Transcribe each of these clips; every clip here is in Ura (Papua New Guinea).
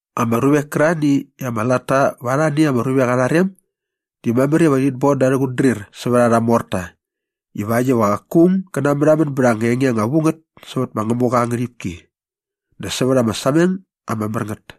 Ama ruvek kärarhani i ama latta va arhani ama ruvek arha rem di mamär iva rhit bon da arhä qutdrir sävät arha morta ivakt iva qaku aung gä namärhamän bät anga enge anga vu ngät sävät ma Ngämuqa aa ngärhipki dä sävät ama sameng ama mär ngät.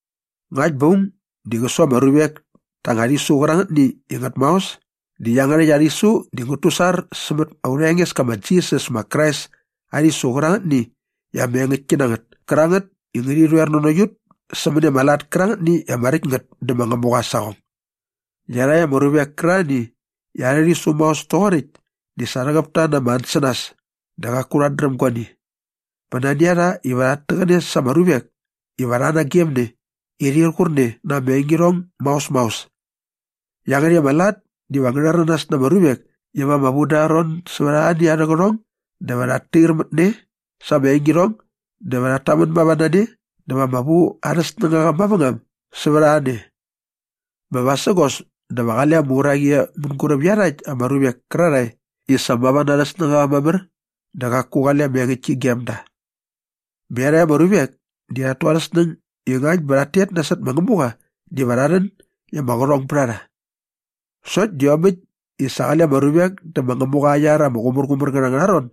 Ngakt bä aung di qä su ama ruvek ta anga rhisu qärangätni i ngät maos di iangärhäkt aa rhisu di ngät tusar sämät aurha Engeska ma Jisas ma Krais aa rhisu qärangätni i ama engäktki na ngät kärangät i ngärhi rhoer nanokt ut sämäni ama lat kärangätni i ama räkt ngät dä ma Ngämuqa aa saqong. Iarhakt ama ruvek kärarhani i arhä rhisu maos toqoräkt di sa rhäqäp ta na ama ansänas dä qaku rhat dräm guani. Bä nani a rha iva rhat täqäne sa ama ruvek iva rha nagemne i rhir qur ne na ama engirhong maos maos. Iangärhäkt ama lat diva ngä rhäranas na ama ruvek iva ama vu da arha ron sävät arhani arhä qärhong dä va rhat tair mät ne sa ama engirhong dä va rhat tamän mava na ne dä va ama vu arhä snängaqa mavängam sävät a ne. Bä vasägos dä va qale ama uraqi e mänguräp iarhakt ama ruvek kärarhae i sa mava na arhä snängaqa mamär dä qaku qale ama engäktki e gem da. Bä iarhakt ama ruvek di rhat tu arhä snäng i ngakt bä rhat tet nasot ma Ngämuqa diva rha rhän i ama qärhong bät a rha. Sokt di iomäkt i sa qale ama ruvek dä ma Ngämuqa aa iar ama qumärqumär ngät angärha ron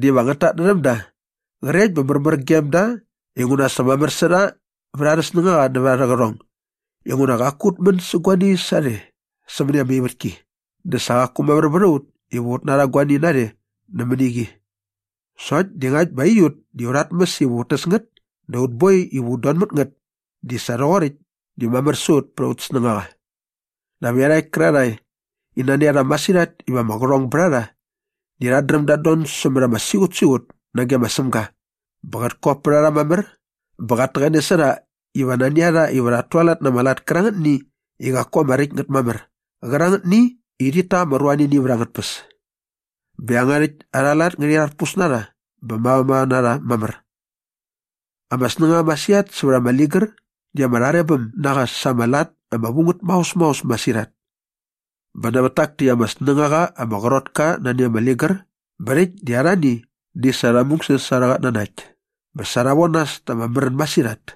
diva ngät tatnärhäm da qrekt bä märmär gem da inguna sa mamär sä rha vät arhä snängaqa nävät arhä qärhong inguna qaku ut män sä guani sarhe sämäni ama ivätki dä sa qaku mamär vät a ut iva ut narha guani narhe nämäni qi. Sokt di ngakt bä aiut di aurha tmäs iva ut täs ngät dä aut boi iva ut don mät ngät di sa rhoqoräkt di mamär sä ut pät aut snängaqa. Dap iarhakt kärarhae i nani a rha masirhat iva ama qärhong bät a rha di rhat dräm dat don sämät ama siqutsiqut nage ma Sämga bä qät kop pät a rha mamär bä qat täqäne sä rha iva nani a rha iva rhat tualat na ama lat kärangätni i qaku ama räkt ngät mamär qärangätni i rhit ta ama ruanini vät angät tpäs. Bä iangärhäkt arha lat ngärhi rharpus na rha bä mavamava na rha mamär. Ama snängaqa masirhat sävät ama ligär di ama rharebäm na qa sa ama lat ama vu ngät maos maos masirhat. Bä nävät tak täkt ama snängaqa ama qrot ka nani ama ligär bä rhäkt di arhani di sa rha mungsäs sa arhä qatnanakt bä sa rha von nas ta ama märän masirhat.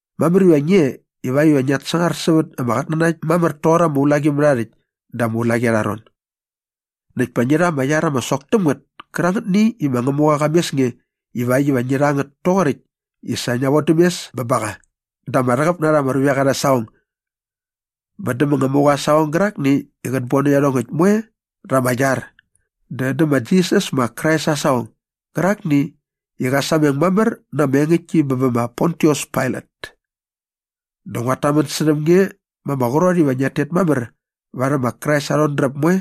Mamär iva ngi e ivakt iva ngiat sangar sävät ama qatnanakt mamär doqor ama ulaqimärhaarhäkt da ama ulaqi arha ron. Näkt pa ngi rha ama iar ama sok täm ngät kärangätni i ma Ngämuqa qa mes nge ivakt iva ngi rha ngät toqoräkt i sa ngia vodäm mes bä ba qa da ama rhäqäp na rha ama ruvek arhä saqong bä dä ma Ngämuqa aa saqong gärakni i qät bon dä iarhongäkt moe rha ama iar dä dä ma Jisas ma Krais aa saqong gärakni i qa sameng mamär na ama engäktki bä bä ma Pontius Pailat. Dä nguat tamän särhäm nge ma ama qrot iva ngiat tet mamär varhäm ma Krais aa rhodräp moe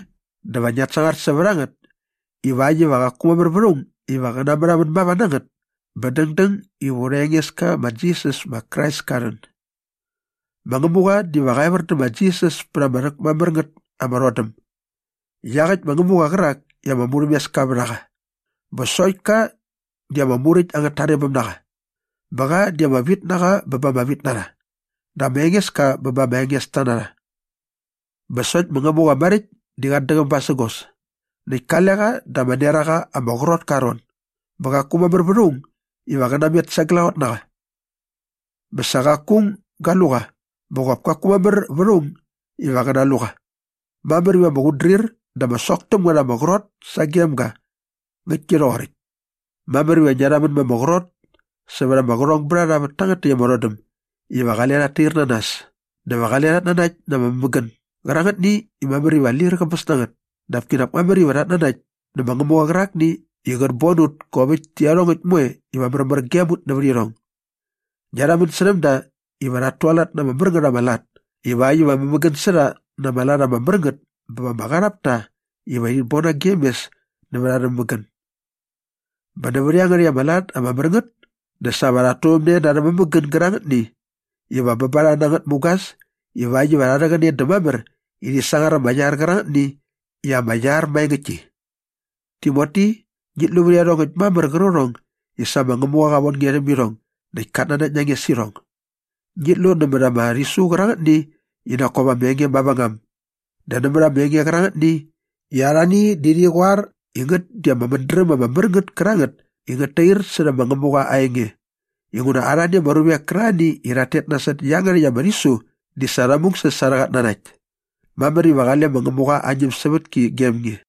dä va ngiat sangar sävät a ngät ivakt iva qaku mamär vät aung iva qä namärhamän mava na ngät bä dängdäng iva aurha Engeska ma Jisas ma Krais ka rhän. Ma Ngämuqa diva qa evär dä ma Jisas pät ama rhäkmamär ngät ama rhodäm iaqäkt ma Ngämuqa qärak i ama murhämeska vät a qa bä sokt ka di ama muräkt angät tarebäm na qa bä qa di ama vitnaqa bä ba ama vitnarha dä ma Engeska bä ba ama engesta na qa. Bä sokt ma Ngämuqa maräkt di qat däqäm basägos näkt kale qa da ama neraqa ama qrot ka aa ron bä qaku mamär vät aung iva qä namet sa glaqot na qa. Bä sa qaku aung ga lu qa bä qop kaku mamär vät aung iva qä nalu qa. Mamär iva ama qutdrir dä ama sok täm ngät ama qrot sagem ga. Ngäktki rhoqoräkt. Mamär iva ngia rhamän ma ama qrot särha ama qärhongbärharha vät tangät täkt ama rhodäm iva qale rhat tair na nas dä va qale rhat nanakt na ama mämägän gärangätni i mamär iva lir qäbäs na ngät dap kinak mamär iva rhat nanakt nä ma Ngämuqa qärakni i qät bon ut kop äkt tä iarhongäkt moe iva märmär gem ut nävät irhong. Ngia rhamän särhäm da iva rhat tualat na ama mär ngät ama lat ivakt iva mämägän sä rha na ama lat ama mär ngät bä va ama qarhap ta iva rhit bon nagem mes nävät arhä mämägän. Bä nävät iangärhäkt arha lat ama mär ngät dä sa rhat turhämne na arhä mämägän gärangätni iva bä ba rha na ngät mugas ivakt iva rha rhäqäne dä mamär i rhi sangar ama iar qärangätni i ama iar maengäktki. Timoti, ngit lu vät iarhongäkt mamär qärqärhong i sa ma Ngämuqa qa von nge rhäm irhong näkt kat nanakt na nge sä irhong. Ngit lu nämät ama rhisu qärangätni i nak kop ama enge mavängam dä nämät ama enge qärangätni i arhani di rhi qoar i ngät di ama mädräm ama mär ngät kärangät i ngät tair särhä ma Ngämuqa aa enge inguna arhani ama ruvek kärarhani i rhat tet nasot iangärhäkt ama rhisu di sa rha mungsäs sa arhä qatnanakt. Mamär iva qale ma Ngämuqa aa ñämsävätki gem nge.